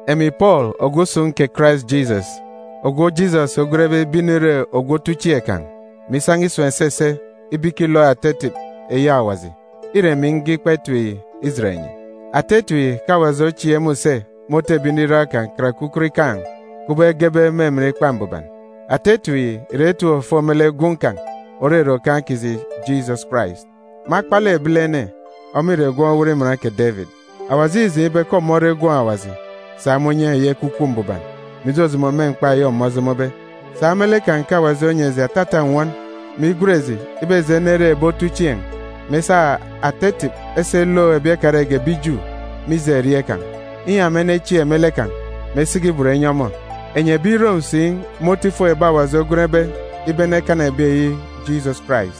Emi Pọọlu ogwu usun̄ kè Karais Jisọs, ogwu Jisọs ogwenbe ibe inire ogwu otuchieen̄ kan̄, mè isan̄a isun̄ esese ibe ikilook ata etip eyi Awaji, îre emi nge ikpa etip yi ijet enyi. Ata etip yi ke Awaji ochieek me use inan̄a me otu ebi nriran kan̄ karake ukot ikaan̄, kubọk egebe me emen Ikpa Mbuban. Ata etip yi ìre etip òfo me lek Gwun̄ kan̄, òrere Okaan̄ kiji Jisọs Karais. Me akpalek ebilene, ọmọ ìre gwun̄ owot iman kè Debit. Awaji îjeen̄ ibe ke ọmọ ore Gwun̄ Awaji, sa me unye eyi Ekwukwu Mbuban, mè ijojomo me mkpa eyi ọmọ ojomobe. Sa me lek kan̄ ke Awaji onyi eji atata nnwọn, mè igwen eji ibe eji enere ebi otuchieen̄, mè esa ata etip esi elook ebi ekarege ebi Ju, mije erieen̄ kan̄, inyi ema enechieek me lek kan̄, mè esiki ibot enyi ọmọ. Enyi ebi Rom si me otu ifuk ebi Awaji ogwenbe ibe enekana ebi eyi Jisọs Karais.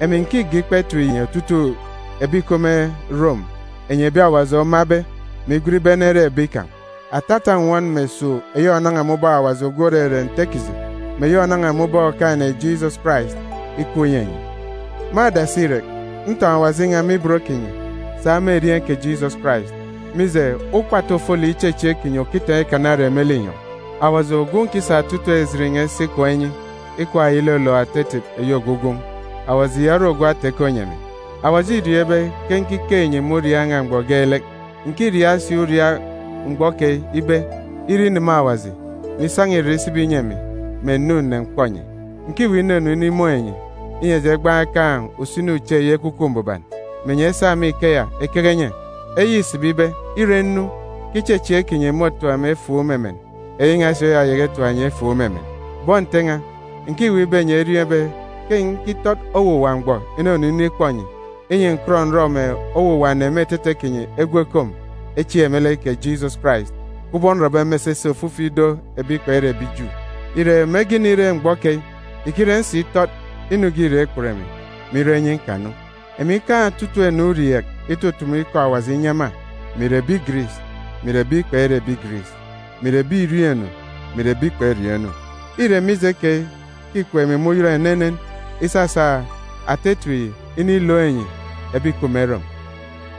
Emi ǹkige ikpa etip yi ijet enyi otutuuk ebi ìkup me Rom, enyi ebi Awaji omabe, mè igwen ibe enere ebi kan̄. Atata nnwọn mè esuuk eyi ònan̄a me ubọk Awaji ogwu òrere Nte kiji, mè eyi ònan̄a me ubọk Okaan̄-ene Jisọs Karais ikup inyi enyi. Me adasi irek, ntọn̄ Awaji n̄a me ibot kinyi, sa me erieen̄ kè Jisọs Karais, mije, ukpatu ofolek ichechieek kinyi òkitaan̄ ikana ere me linyọn̄. Awaji ogwu nkisa otutuuk ejit n̄a isi ikwaan̄ inyi, ikwaan̄ eyi ilolook ata etip eyi ogwu Gwun̄, Awaji ya ore ogwu ata-ikọ inyi emi. Awaji îriọọn̄ ibe ke nkikeek enyi me uriaak n̄a mgbọ geelek. Ǹkiriaak si uriaak mgbọ keyi ibe, ire ineme Awaji, mè isan̄a irek isibi inyi emi, mè ǹnu ǹnemkpọ enyi. Ǹkiweek inunu inimun̄ enyi, inyi eji egbaan̄ ekaan̄ usini uche eyi Ekwukwu Mbuban, mè enyi esa me ikeya ekeke enye. Eyi ìsibi ibe, ire nnu, ke ichechieek kinyi môtap emi efuuk me emen, eyi n̄a si môtatap enyi efuuk me emen. Bọn Nte n̄a, ǹkiweek ibe enyi eriọọn̄ ibe ke nkitọt owuwa mgbọ inunu inikpọ enyi, inyi ǹkọt ǹrọ mè owuwa ene me etete kinyi egwu ekom echieek me lek kè Jisọs Karais, kubọk nrọbe me esese ofifi ido ebi kpere ebi Ju. Ire, mege inire mgbọ keyi, ìkire nsitọt, inu ge îra ikput emi, mè irọ inyi nkanu. Emi nkaan̄ otutuuk ene urieek itutumu ikọ Awaji inyi ema, mè ìre ebi Giris, mè ìre ebi kpere ebi Giris, mè ìre ebi ìriọọn̄ inu, mè ìre ebi kperiọọn̄ inu. Îre mije keyi ke îkup emi me uyọt enenen isasa ata etip ya inilook enyi ebi ìkup me Rom.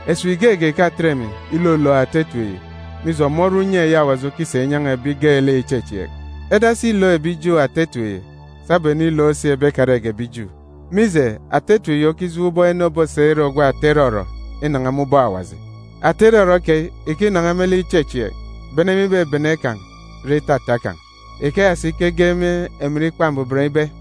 Esip geege ìkatet emi ilolook ata etip yi, mije, ọmọ ore unye eyi Awaji okisa inyan̄a ebi geelek ìchechieek. Edasi ilook ebi Ju ata etip yi, sabum enilook si ebi ekarege ebi Ju. Mije, ata etip yi okijeen̄ ubọk ene obosa ire ogwu ata irọrọ inan̄a me ubọk Awaji. Ata irọrọ keyi ìkinan̄a me lek ichechieek, bene me ibebene kan̄ re itata kan̄. Ikeya si ke ege me emen Ikpa Mbuban ibe,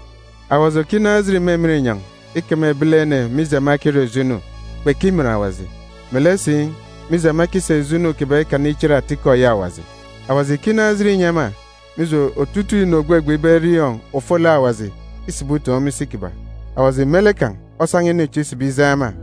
Awaji òkinaan̄ ejit me emen inyọn̄ ikeme ebilene, mije ema ekirọ ijo inu, kpekimin Awaji, melek si, mije ema ekisa ijo inu kiban̄ ikana ichit atikọ eyi Awaji. Awaji ìkinaan̄ ejit inyi ema, mije, otutuuk inu ògbegbe ibe eriọọn̄ ofolek Awaji îsibi utoon̄ me isi kiban̄. Awaji me lek kan̄ osan̄a inu chi isibi ijeen̄ ema.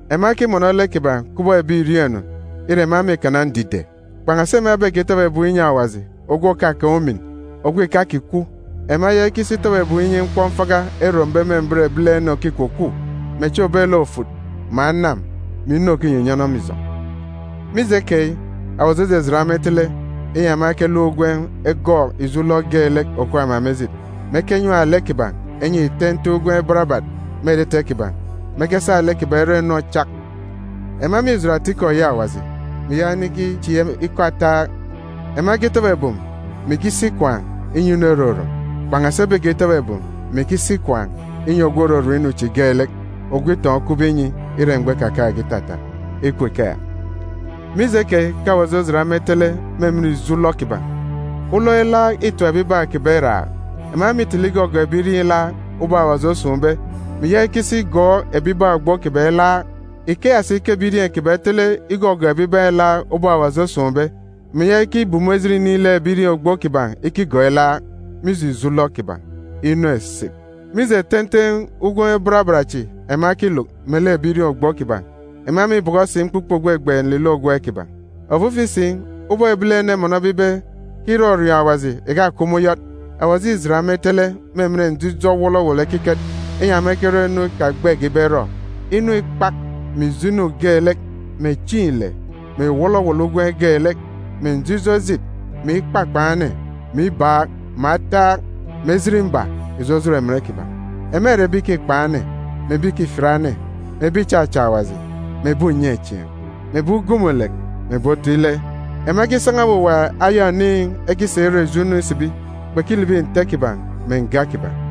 Ema ekimọnọ lek kiban̄ kubọk ebi ìriọọn̄ inu, ire, ema mîkana ndide. Kpan̄asi ema ebekitọbọ ebum inyi Awaji ogwu òkakaan̄ umin, ogwu ìkakikwu, ema eyaka ikisi itọbọ ebum inyi mkpọmfaka erombe me mbet ebilene òkikwukwu, mè echi òbet lek ofut, mè anam, mè inu òkinyinyọnọ me ijọn̄. Mije keyi, Awaji ojijit ema itele, inyi ema ekeluk ugwem egọọk ijo ulọk geelek òkup ema me ejit, mè ekenyam lek kiban̄ enyi ten̄ten̄ ugwem barabat me etete kiban̄, mè ekesa lek kiban̄ erọ inu ochak. Ema mîjit atikọ eyi Awaji, mè iyaka inikichieek ikọ ataak. Ema ekitọbọ ebum, mè ikisi ikwaan̄ inyi inu erorom, kpan̄asi ebekitọbọ ebum mè ikisi ikwaan̄ inyi ogwu òrorom inu chi geelek, ogwu itọn̄ okupbe inyi ire mgbọ ikakaan̄ge itata. Ikup ikeya! Mije keyi ke Awaji ojit ema itele me emen ijo ulọk kiban̄. Ulọk ilaak îtap ebibaan̄ kiban̄ iraak. Ema mîtele igọgọọk ebirieen̄ ilaak, ubọk Awaji osun̄be, mè iyaka ikisi igọọk ebibaan̄ ogbo kiban̄ ilaak. Ikeya si ke ebirieen̄ kiban̄ etele igọgọọk ebibaan̄ ilaak, ubọk Awaji osun̄be, mè iyaka ikibumu ejit inin̄ lek ebirieen̄ ogbo kiban̄ ikigọọk ilaak, mije ijo ulọk kiban̄. Inu esip! Mije ten̄ten̄ ugwem barabat chi ema ekiluk melek ebirieen̄ ogbo kiban̄, ema mîbọkọ si mkpukpe ògbegbe nlilọ ugwem kiban̄. Ofifi si, ubọk ebilene emọnọbe ibe ke irọriọọn̄ Awaji ìkakup me uyọt, Awaji îjit ema itele me emen njijọ wọlọwọlọ ekiket, inyi ema ekerọ inu ikagbege ibe erọ. Inu ikpak, mè ijo inu geelek, mè chieen̄ ile, mè wọlọwọlọ ugwem geelek, mè njijọ ejit, mè ikpakpan̄ ene, mè ibaak, mè ataak, mè ejit mba ìjojot emen kiban̄. Ema ìre ebi ìkikpa ene, mè ebi ìkifiat ene, mè ebi ìchacha Awaji, mè ebi unyechieen̄, mè ebi ugumulek, mè ebi otu ile. Ema ekisan̄a owuwa aya oniin̄ ekisa irọ ijo inu isibi, kpekilibi nte kiban̄ mè nga kiban̄.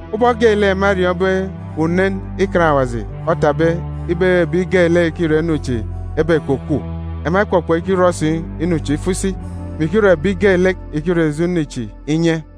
Ubọk geelek ema eriọọn̄be unen Ikan Awaji otapbe ibe ke ebi geelek ìkirọ inu chi ebekwukwu, ema ekpọkpọ ikirọ si inu chi ifo isi, mè ikirọ ebi geelek ìkirọ ijo inu chi inye.